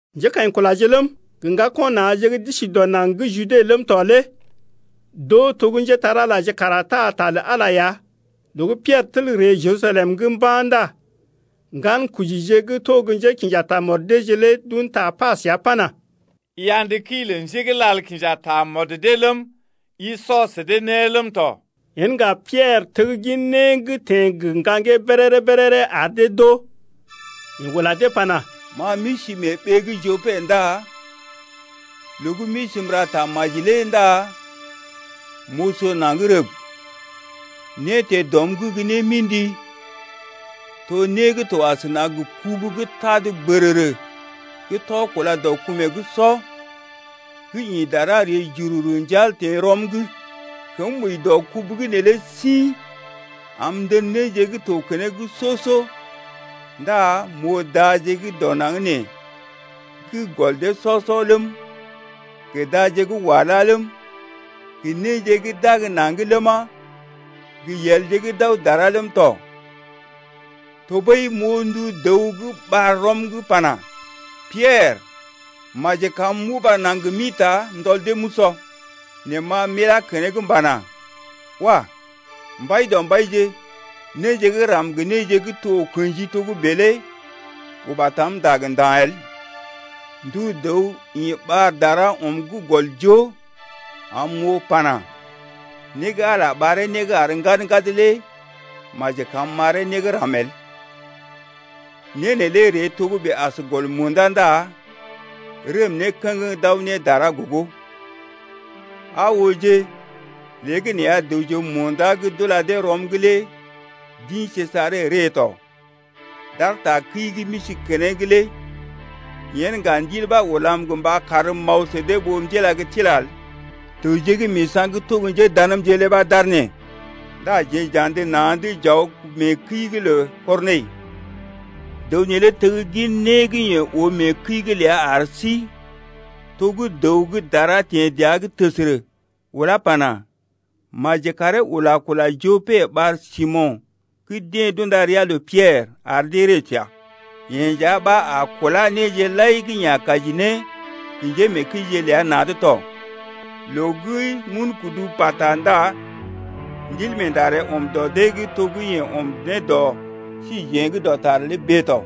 Njékaḭkulaje ləm, gə ŋgako̰ na̰je gə́ d’isi dɔ naŋg gə́ Jude ləm tɔ lé d’oo to gə́ njépole-magəje kara taa ta lə Ala lé ya tɔ. Loo gə́ Piɛrə tel ree Jerusalem mba̰ ndá ŋgankojije gə́ to gə́ njékḭja tamɔd deeje lé d’un ta pa səa pana: I andə kəi lə njé gə́ lal kinja tamɔd dee ləm, i sɔ sə dee né ləm tɔ. Yen ŋga Piɛrə teggin né gə́ teḛ lé gə ŋgaŋgee béréré-béréré ar dee d’oo. Yeḛ ula dee pana: Ma m’isi mee ɓee gə́ Jope ndá loo gə́ m’isi m’ra tamaji lé ndá m’oso naŋg rəb, né teḛ dɔm’g gə́ némḭdi bèe, to né gə́ to asəna gə kubu gə́ tad bərərə gə́ tɔ kúla dɔ kumeeje’g sɔ gə́ ḭ dara ree jururu njal teḛ rɔm’g. Kəm wəi dɔ kubu gə́ neelé sḭ am m’tən néje gə́ to keneŋ soo-soo ndá m’oo daje gə́ dɔ naŋg nee gə́ gɔl dee sɔ-sɔ ləm, gə daje gə́ wala ləm, gə néje gə́ d’ag naŋg ləma, gə yelje gə́ d’aw dara ləm tɔ. Tɔɓəi m’oo ndu dəw gə́ ɓar rɔm’g pana: Piɛrə, maji kam m’uba naŋg m’ḭta m’tɔl dee m’usɔ. Nɛ ma m’ilá keneŋ m’pana: Wah! Mbaidɔmbaije, néje gə́ ram gə néje gə́ to kḛji togə́bè lé uba tam ndag nda̰ el. Ndu dəw ḭ ɓar dara ɔm gə́ gɔl joo am m’oo pana: Né gə́ Ala ɓaree né gə́ àr ŋgad-ŋgad lé maji kam m’ɓaree né gə́ ram el. Né neelé ree togə́bè as gɔl munda ndá rəm ne kə̰geŋ d’aw ne dara gogo. Aa ooje, léegəneeya dəwje munda gə́ d’ula dee rɔm’g lé d’ḭ Sejare ree tɔ, d’aar takəi gə́ m’isi keneŋ lé. Yen ŋga Ndil ɓa ulam gə mba karm m’aw sə dee ɓó m’tila gə tila el. Dəwje gə́ misa̰ gə́ to gə́ njéndamje lé ɓa d’aar nee, ndá jeḛ j’andə na̰’d j’aw mee kəi’g lə Kɔrnəi. Dəw neelé teggin né gə́ yeḛ oo mee kəi’g ləa ar sí, to gə́ dəw gə́ dara teḛ dəa’g təsərə ulá pana: Maji karee ula kula Jope ɓar Simo̰ gə́ deḛ d’unda ria lə Piɛrə ar dee ree səa. Yeḛ nja ɓa a kulá néje lai gə́ yeḛ a kaji ne, gə njémeekəije ləi na̰’d tɔ. Loo gə́ m’un kudu pata ndá Ndilmeenda ree ɔm dɔ dee’g to gə́ yeḛ ɔm ne dɔ síjeḛ’g dɔtar lé bèe tɔ.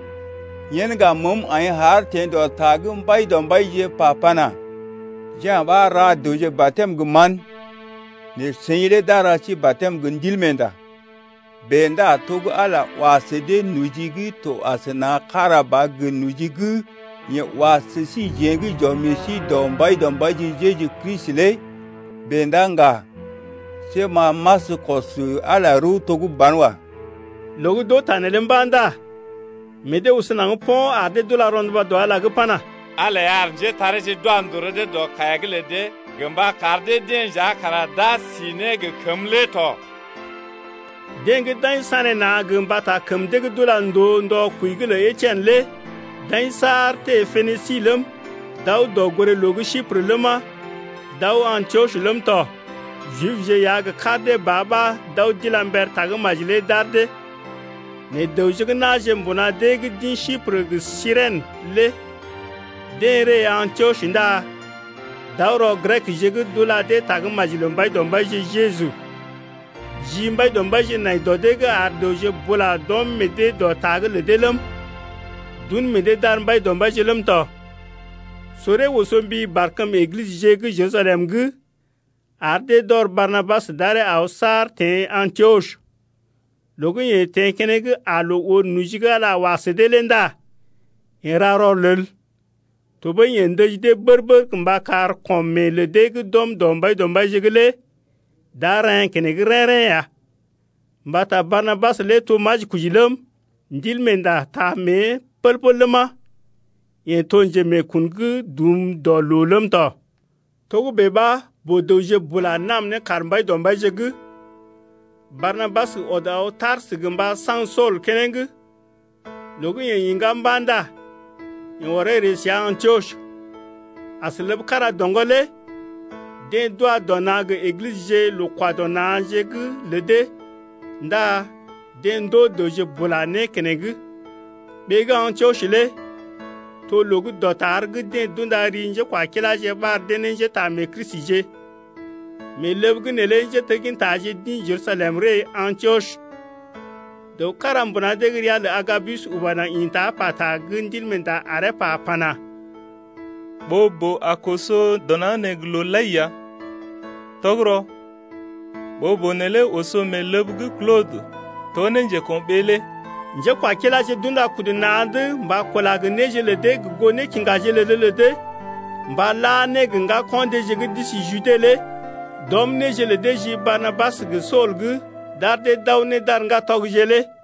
Yen ŋga məəm aḭ haar teḛ dɔ ta gə́ Mbaidɔmbaije pa pana: Ja̰ ɓa ra dəwje batɛm gə mán, nɛ seḭ lé d’a ra sí batɛm gə Ndilmeenda. Bèe ndá to gə́ Ala wa sə dee noji gə́ to asəna kára ba gə noji gə́ yeḛ wa sə síjeḛ gə́ j’ɔm meḛ sí dɔ Mbaidɔmbaije Jeju Kristi lé bèe ndá ŋga, see ma m’askəm kɔs Ala lé rəw to gə́ banwa. Loo gə́ d’oo ta neelé mba̰ ndá meḛ dee oso naŋg po̰ ar dee d’ula rɔnduba dɔ Ala’g pana: Ala lé ya ar njétareeje d’wa ndòo rɔ dee dɔ kaiya’g lə dee gə mba kar dee-deḛ nja kara d’a si ne gə kəmə lé tɔ. Deḛ gə́ d’aḭ sanéna̰ gə mbata kəm dee gə́ d’ula ndòo ndɔ kwəi’g lə Etien lé d’aḭ saar teḛ Penisi ləm, d’aw dɔgoré-loo gə́ Siprə ləma, d’aw Antiɔs ləm tɔ. Jibje ya gə kar dee ba ɓa d’aw d’ila mber tagə́maji lé d’ar dee. Nɛ dəwje gə́ na̰je mbuna deḛ gə́ d’ḭ Siprə gə Sirèn lé deḛ ree Antiɔs ndá d’aw rɔ Grekje’g d’ula dee tagə́maji lə Mbaidɔmbaije Jeju. Ji Mbaidɔmbaije nai dɔ dee’g ar dəwje bula d’ɔm meḛ dee dɔ ta’g lə dee ləm, d’un meḛ dee d’ar Mbaidɔmbaije ləm tɔ. Soree oso mbi barkəm Eglisəje gə́ Jerusalem ar dee d’ɔr Barnabas d’aree aw saar teḛ Antiɔs. Loo gə́ yeḛ teḛ keneŋ aa loo oo noji gə́ Ala wa sə dee lé ndá yeḛ ra rɔlel, tɔɓəi yeḛ ndəji dee bər-bər mba kar kɔm meḛ lə dee gə́ d’ɔm dɔ Mbaidɔmbaije’g lé d’a reḛ́ keneŋ rḛ́-rḛ́ ya. Mbata Barnabas lé to majikoji ləm, Ndilmeenda taa mée pəl-pəl ləma, yeḛ to njemeekun gə́ dum dɔ loo ləm tɔ. Togə́bè ɓa boo-dəwje bula nam ne kaar Mbaidɔmbaije’g lé. Barnabas ɔd aw Tarsə gə mba saŋg Sool keneŋ. Loo gə́ yeḛ iŋgá mba̰ ndá yeḛ ɔree ree səa Antiɔs. As ləb kára doŋgɔ lé deḛ d’wa dɔ na̰ gə Eglisəje loo-kwa-dɔ-na̰je’g lə dee ndá deḛ ndoo dəwje bula né keneŋ. Ɓee gə́ Antiɔs lé to loo gə́ dɔtar gə́ deḛ d’unda ri njékwakiláje ɓar dee ne njétaamee-Kristije. Mee ləb’g neelé njéteggintaje d’ḭ Jerusalem ree Antiɔs. Dəw kára mbuna dee’g ria lə Agabus uba naŋg ḭta pata gə́ Ndil ɓa aree pa pana: Ɓoo-boo a koso dɔ naŋg nee gə loo lai ya. Tɔgərɔ ɓoo-boo neelé oso mee ləb gə́ Klodə to ne njeko̰ɓee lé. Njékwakiláje d’unda kudu dee na̰’d mba kula gə néje lə dee gə goo nékiŋgaje lə dee lə dee mba la ne gə ŋgako̰ deeje gə́ d’isi Jude lé. D’ɔm néje lə dee ji Barnabas gə Sool’g d’ar dee d’aw ne d’ar ŋgatɔgje lé tɔ.